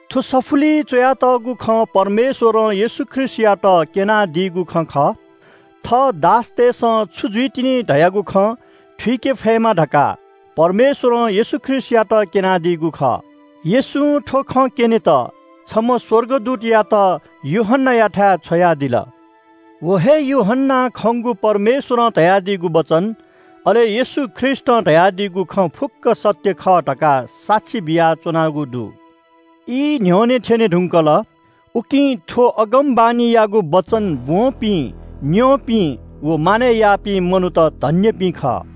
थ्‍व सफुलिइ च्‍वयातःगु खँ परमेश्‍वरं येशू ख्रीष्‍टयात क्‍यनादीगु खँ खः। थः दासतय्‌सं छु जुइतिनि धयागु खँ थुइके फयेमा धकाः परमेश्‍वरं येशू ख्रीष्‍टयात क्‍यनादीगु खः। येशूं थ्‍व खँ क्‍यनेत छम्‍ह स्‍वर्गदूतयात यूहन्‍नायाथाय् छ्वयादिल। व हे यूहन्‍नां खंगु परमेश्‍वरं धयादीगु वचन, अले येशू ख्रीष्‍टं धयादीगु खँ फुक्‍क सत्‍य खः धकाः साक्षी बियाच्‍वनागु दु। ई न्‍ह्यःने थ्‍यने धुंकल। उकिं थ्‍व अगमवाणीयागु वचन ब्‍वंपिं, न्‍यंपिं, व मानय् याःपिं मनूत धन्‍यपिं खः।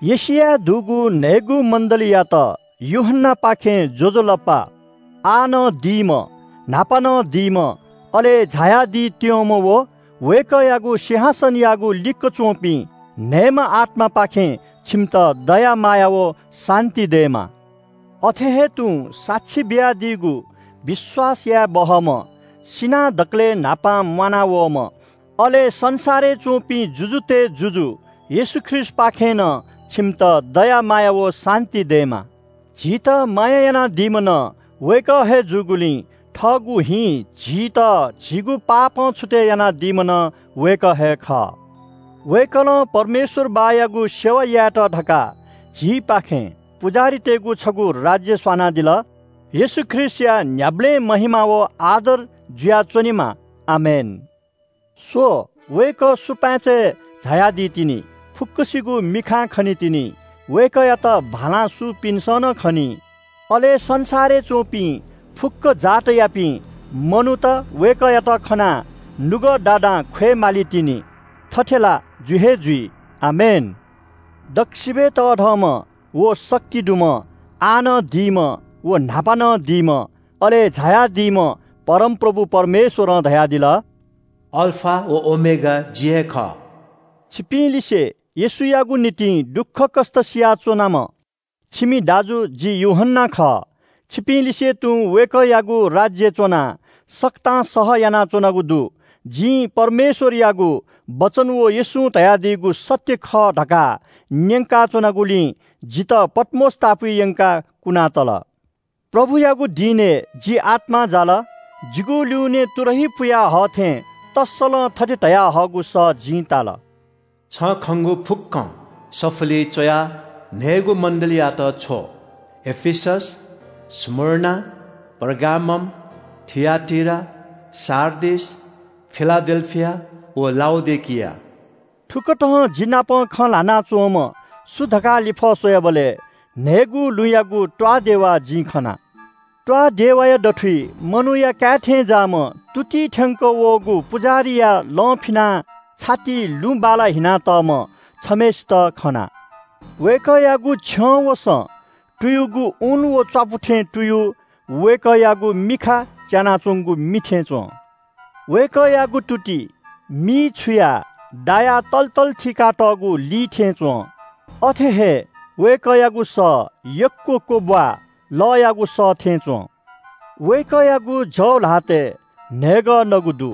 एशियाय् दुगु न्‍हय्‌गू मण्‍डलीयात यूहन्‍नापाखें ज्‍वजलपा। आः नं दीम्‍ह, न्‍हापा नं दीम्‍ह, अले झायादीत्‍यंम्‍ह, व वय्‌कःयागु सिंहासनयागु लिक्‍क च्‍वंपिं न्‍हय्‌म्‍ह आत्‍मापाखें छिमित दया माया व शान्‍ति दयेमा। अथे हे तुं साक्षी बियादीगु विश्‍वास याये बहःम्‍ह, सिनाः दकलय् न्‍हापां म्‍वानावःम्‍ह, अले संसारय् च्‍वंपिं जुजुतय् जुजु येशू ख्रीष्‍टपाखें नं छिमित दया माया व शान्‍ति दयेमा। झीत माया यानादीम्‍ह नं वय्‌कः हे जूगुलिं थःगु हिं झीत झीगु पापं छुतय् यानादीम्‍ह नं वय्‌कः हे खः। वय्‌कलं परमेश्‍वर बाःयागु सेवा यायेत धकाः झीपाखें पुजाहारीतय्‌गु छगू राज्‍य स्‍वनादिल। येशू ख्रीष्‍टया न्‍ह्याबलें महिमा व आदर जुयाच्‍वनेमा। आमेन! “स्‍व, वय्‌कः सुपाँचय् झायादी तिनि, फुक्‍कसिगु मिखां खनीतिनि, वय्‌कःयात भालां सूपिन्‍सं नं खनी। अले संसारय् च्‍वंपिं फुक्‍क जातियापिं मनूत वय्‌कःयात खनाः नुगः दादां ख्‍वये मालीतिनि। थथे ला जु हे जुइ। आमेन!” दक्‍वसिबय् तःधंम्‍ह व शक्ति दुम्‍ह, आः नं दीम्‍ह व न्‍हापा नं दीम्‍ह, अले झायादीम्‍ह परमप्रभु परमेश्‍वरं धयादिल – “अल्‍फा व ओमेगा जि हे खः।” छिपिंलिसे येशूयागु निंतिं दुःखकष्‍ट सिया च्‍वनाम्‍ह छिमि दाजु जि यूहन्‍ना खः। छिपिंलिसे तुं वय्‌कःयागु राज्‍यय् च्‍वनाः सकतां सह यानाच्‍वनागु दु। जिं परमेश्‍वरयागु वचन व येशूं धयादीगु सत्‍य खः धकाः न्‍यंकाच्‍वनागुलिं जितः पत्‍मोस टापुइ यंकाः कुनातल। प्रभुयागु दिनय् जि आत्‍मां जाल। जिगु ल्‍युने तुरही पुया हः थें तस्‍सलं थथे धयाहःगु सः जिं ताल – “छं खंगु फुक्‍कं सफुलिइ च्‍वयाः न्‍हय्‌गू मण्‍डलीतय्‌त छ्व – एफिसस, स्‍मुर्ना, पर्गामम, थिआटीरा, सार्डिस, फिलाडेल्‍फिया व लाउडिकिया।” थुकथं जि नाप खँ ल्‍हाना च्‍वंम्‍ह सु धकाः लिफः स्‍वयाबलय् न्‍हय्‌गू लुँयागु त्‍वाःदेवा जिं खना। त्‍वाःदेवाया दथुइ मनूया काय् थें ज्‍याःम्‍ह तुतिइ थ्‍यंक वःगु पुजाहारीया लं फिनाः छातिइ लुँ बाला हिनातःम्‍ह छम्‍हय्‌सित खना। वय्‌कःयागु छ्यं व सँ तुयुगु ऊन व च्‍वापु थें तुयु। वय्‌कःयागु मिखा च्‍यानाच्‍वंगु मि थें च्‍वं। वय्‌कःयागु तुति मिइ छुया दायाः तल तल थीकातःगु ली थें च्‍वं। अथे हे वय्‌कःयागु सः यक्‍व क्‍वब्‍वाःलःयागु सः थें च्‍वं। वय्‌कःयागु जव ल्‍हातय् न्‍हय्‌गः नगु दु।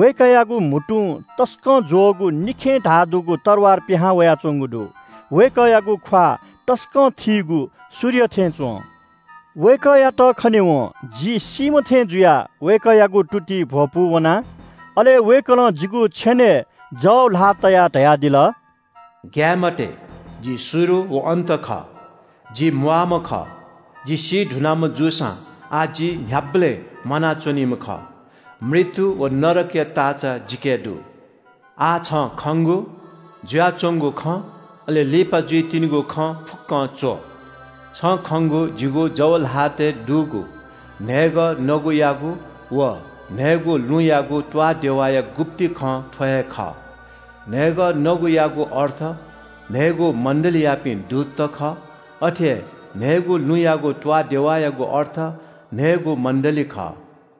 वय्‌कःयागु म्‍हुतुं तसकं ज्‍वःगु निखें धाः दुगु तरवार पिहां वयाच्‍वंगु दु। वय्‌कःयागु ख्‍वाः तसकं थीगु सूर्य थें च्‍वं। वय्‌कःयात खनेवं जि सीम्‍ह थें जुयाः वय्‌कःयागु तुतिइ भ्‍वपू वना। अले वय्‌कलं जिगु छेनय् जव ल्‍हाः तयाः धयादिल – “ग्‍याये मते। जि शुरु व अन्‍त खः। जि म्‍वाःम्‍ह खः। जि सी धुनाम्‍ह जूसां आः जि न्‍ह्याबलें म्‍वाना च्‍वनीम्‍ह खः। मृत्‍यु व नरकया ताःचा जिके दु। “आः छं खंगु, जुयाच्‍वंगु खँ, अले लिपा जुइतिनिगु खँ फुक्‍कं च्‍व। छं खंगु जिगु जव ल्‍हातय् दुगु न्‍हय्‌गः नगुयागु व न्‍हय्‌गू लुँयागु त्‍वाःदेवाया गुप्‍ति खँ थ्‍व हे खः। न्‍हय्‌गः नगुयागु अर्थ न्‍हय्‌गू मण्‍डलीयापिं दूतत खः। अथे हे न्‍हय्‌गू लुँयागु त्‍वाःदेवायागु अर्थ न्‍हय्‌गू मण्‍डली खः।”